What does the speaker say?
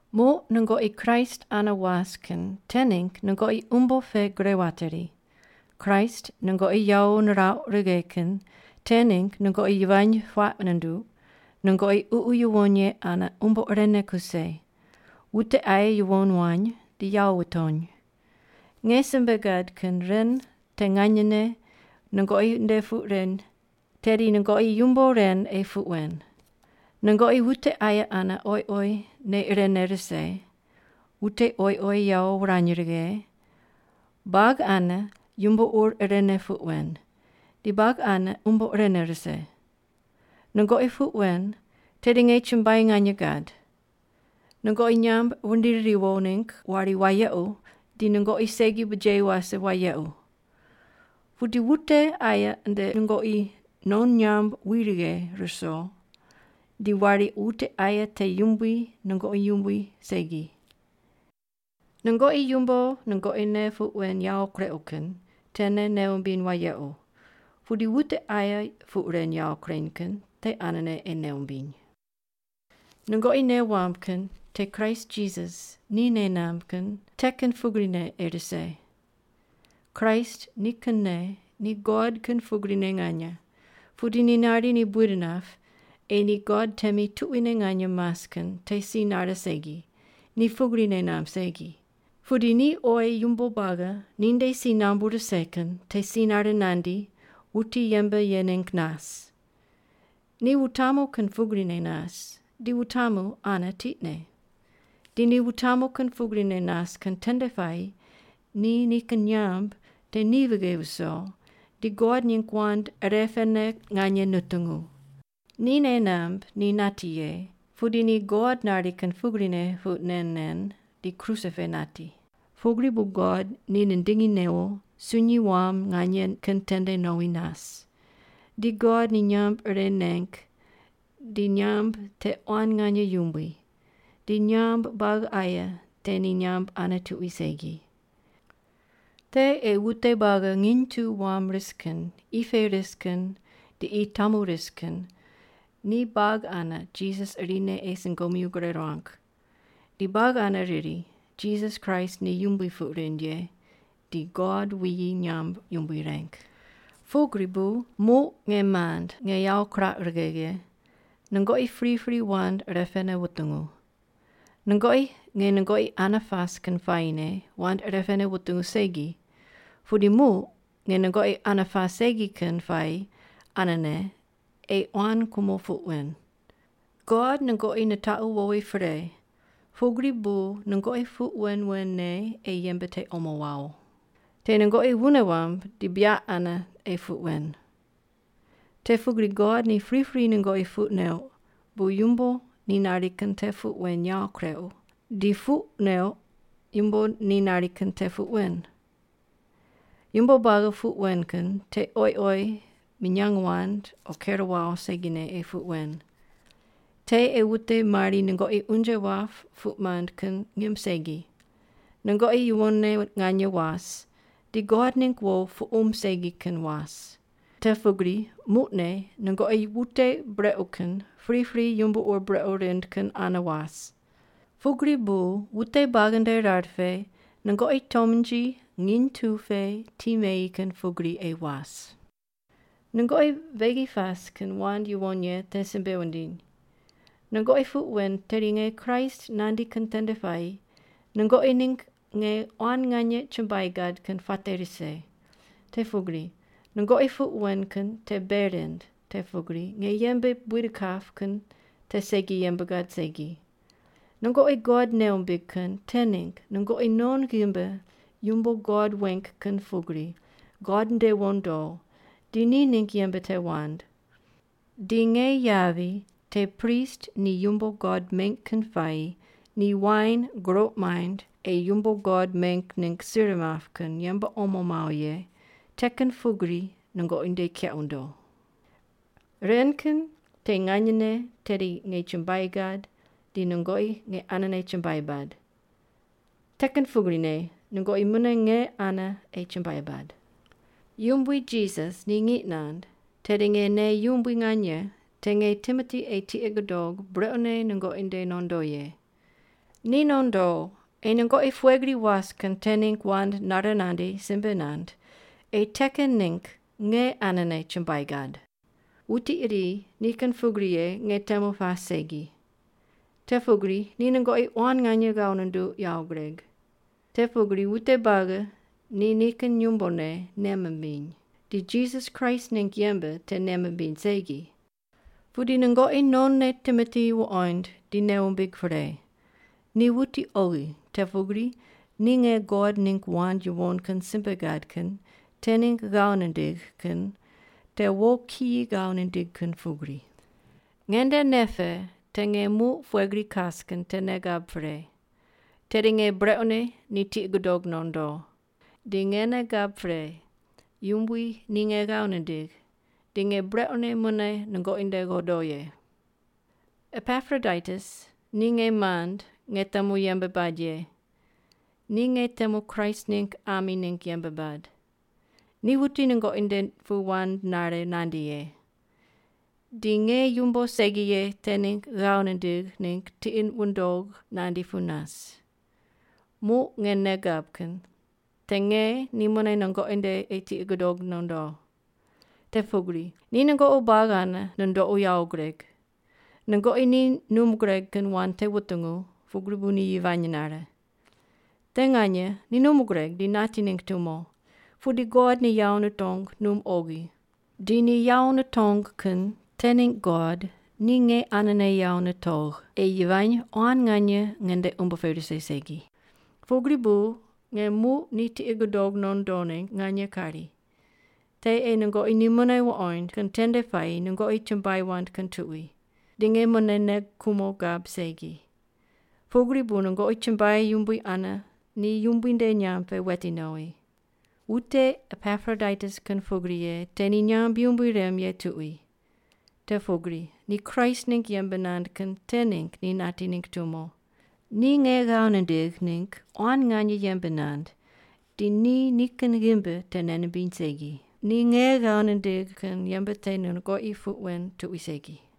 Muq nungoqi Kraist ane was kin te ningg nungoqi umbo pe gre wateri, Kraist nungoqi yawo nirauq righe kin te ningg nungoqi yivany puaq nunduq, nungoqi Ququ Yuwon Ye ane umbo irene kuse, wute aye yuwon wany di yawo wutony. Nge simbe gad kin ren te nganyene nungoqi nde puq ren, tedi nungoqi yumbo ren ei puq wen: Nungoqi wute aye ane oyi oyi nei irene rise, wute oyi oyi yawo wurany righe, buagi ane yumbo ur irene puq wen, di buagi ane umbo irene rise. Nungoqi puq wen tedi nge chumbuai nganye gad. Nungoqi nyamb wundiri riwo ningg wari wayequ di nungoqi segi bujeyi wase wayequ. Pudi wute aye nde nungoqi non nyamb wi righe ruso di wari wute aye te yumbui nungoqi yumbui segi. Nungoqi yumbo nungoqi ne puq wen yawo kureuq kin tene nei wumbiny wayequ, pudi wute aye puq ren yawo kureny kin te anene ei nei wumbiny. Nungoqi nei wamb kin te Kraist Jisas ni nei namb kin te kin pugrine ei rise. Kraist nikinne ni God kin pugrine nganye, pudi ni nari ni buid nap ei ni God temi tuquine nganye mas kin te si nare segi, ni pugri nei namb segi. Pudi ni oyi yumbo buagi ninde si nambu rise kin te si nare nandi wuti yembe ye ningg nas. Ni wutamu kin pugrine nas di wutamu ane tiqne. Di ni wutamu kin pugrine nas kin tende puayi ni nikin nyamb te ni vighe viso di God ningg wand irepene nganye nutungu. Ni nei namb ni nati ye, pudi ni God nari kin pugrine puq nen nen di kruse pe nati. Pugri bu God ni nindingi newo sunyi wam nganye kin tende nowi nas. Di God ni nyamb ire neng di nyamb te quan nganye yumbui, di nyamb buagi aye te ni nyamb ane tuqui segi. Te ei wute buagi nginy tu wam ris kin qi pe ris kin di qi tamu ris kin ni buagi ane Jisas irine ei sungomyu gure ruang, di buagi ane riri, “Jisas Kraist ni Yumbui” puq rind ye di God wuyi nyamb yumbui reng. Pugri bu muq, nge mand nge yawo kirauq righe ye, nungoqi pripri wand irepene wutungu. Nungoqi nge nungoqi ane pas kin puayine wand irepene wutungu segi, pudi muq nge nungoqi ane pas segi kin puayi anene ei quan kumo puq wen. God nungoqi nitaqu wowi pre, pugri bu nungoqi puq wen wen ne ei yembe te omo wawo. Te nungoqi wune wamb di buyaq ane ei puq wen. Te pugri God ni pripri nungoqi puq neuq bu yumbo ni nari kin te puq wen yawo kureuq, di puq neuq yumbo ni nari kin te puq wen. Yumbo buagi puq wen kin te oyi oyi minyang wand o ker wawo segine ei puq wen, te ei wute mari nungoqi unje wap puq mand kin ngim segi, nungoqi yuwonne nganye was, di God ningg wo puqum segi kin was. Te pugri muqne nungoqi wute brequ kin pripri yumbo ur brequ rind kin ane was. Pugri bu wute buagi nde rar pe nungoqi tomnji nginy tu pe ti meyi kin pugri ei was. Nungoqi beghi pas kin wand yuwon ye te simbe wundiny. Nungoqi puq wen tedi nge Kraist nandi kin tende puayi nungoqi ningg nge quan nganye chumbuai gad kin puate rise, te pugri nungoqi puq wen kin te bei rind te pugri nge yembe buid kap kin te segi yembe gad segi. Nungoqi God nei wumbig kin te ningg nungoqi non ghimbi yumbo God weng kin pugri God nde wondo di ni ningg yembe te wand. Di nge yavi te prist ni yumbo God meng kin puayi ni wain guroq maind ei yumbo God meng ningg sir map kin yembe omo mawo ye te kin pugri nungoqi nde keq wundo. Ren kin te nganyene tedi nge chumbuai gad di nungoqi nge anene chumbuai bad. Te kin pugrine nungoqi mune nge ane ei chumbuai bad. Yumbui Jisas ni ngiq nand tedi nge nei yumbui nganye te nge Timoti ei tiqi gudog brequne nungoqi nde nondo ye. Ni nondo ei nungoqi pughe gri was kin te ningg wand nare nandi simbe nand ei te kin ningg nge anene chumbuai gad. Wuti iri ni kin pugri ye nge temu pas segi. Te pugri ni nungoqi quan nganye ghav nunduq yawo gureg. Te pugri wute buagi ni nikin yumbone nei mimbiny, ni Jisas Kraist ningg yembe te nei mimbiny segi. Pudi nungoqi nonne Timoti wuqoind di nei wumbig pre, ni wuti oghi te pugri ni nge God ningg wand yuwon kin simbe gad kin te ningg ghav nindigh kin te wo kiyi ghav nindig kin pugri. Nge nde nei pe te nge muq pughe gri kas kin te nei gab pre, tedi nge brequne ni tiqi gudog nondo. Di nge nei gab pre Yumbui ni nge ghav nindigh di nge brequne mune nungoqi nde godo ye. Epaproditus ni nge mand nge temu yembe bad ye, ni nge temu Kraist ningg ami ningg yembe bad. Ni wuti nungoqi nde pu wand nare nandi ye, di nge yumbo segi ye te ningg ghav nindigh ningg tiqi wundog nandi pu nas. Muq nge nei gab kin te nge ni mune nungoqi nde ei tiqi gudog nondo. Te pugri ni nungoqi buagi ane nundoqu yawo gureg. Nungoqi ni num gureg kin wand te wutungu, pugri bu ni yivany nare. Te nganye ni num gureg di nati ningg tumo. Pudi God ni yawo nitong num oghi. Di ni yawo nitong kin te ningg God ni nge anene yawo nitogh ei yivany quan nganye nge nde umbo pe rise segi. Pugri bu nge muq ni tiqi gudog nondo ningg nganye kari. Te ei nungoqi ni mune wuqoind kin tende puayi nungoqi chumbuai wand kin tuqui. Di nge mune nei kumo gab segi. Pugri bu nungoqi chumbuai yumbui ane ni Yumbui nde nyamb pe weti nowi. Wute Epaproditus kin pugri ye te ni nyamb yumbui rem ye tuqui. Te pugri ni Kraist ningg yembe nand kin te ningg ni nati ningg tumo. Ni nge ghav nindigh ningg quan nganye yembe nand di ni nikin ghimbi te nei nimbiny segi. Ni nge ghav nindigh kin yembe te nungoqi puq wen tuqui segi.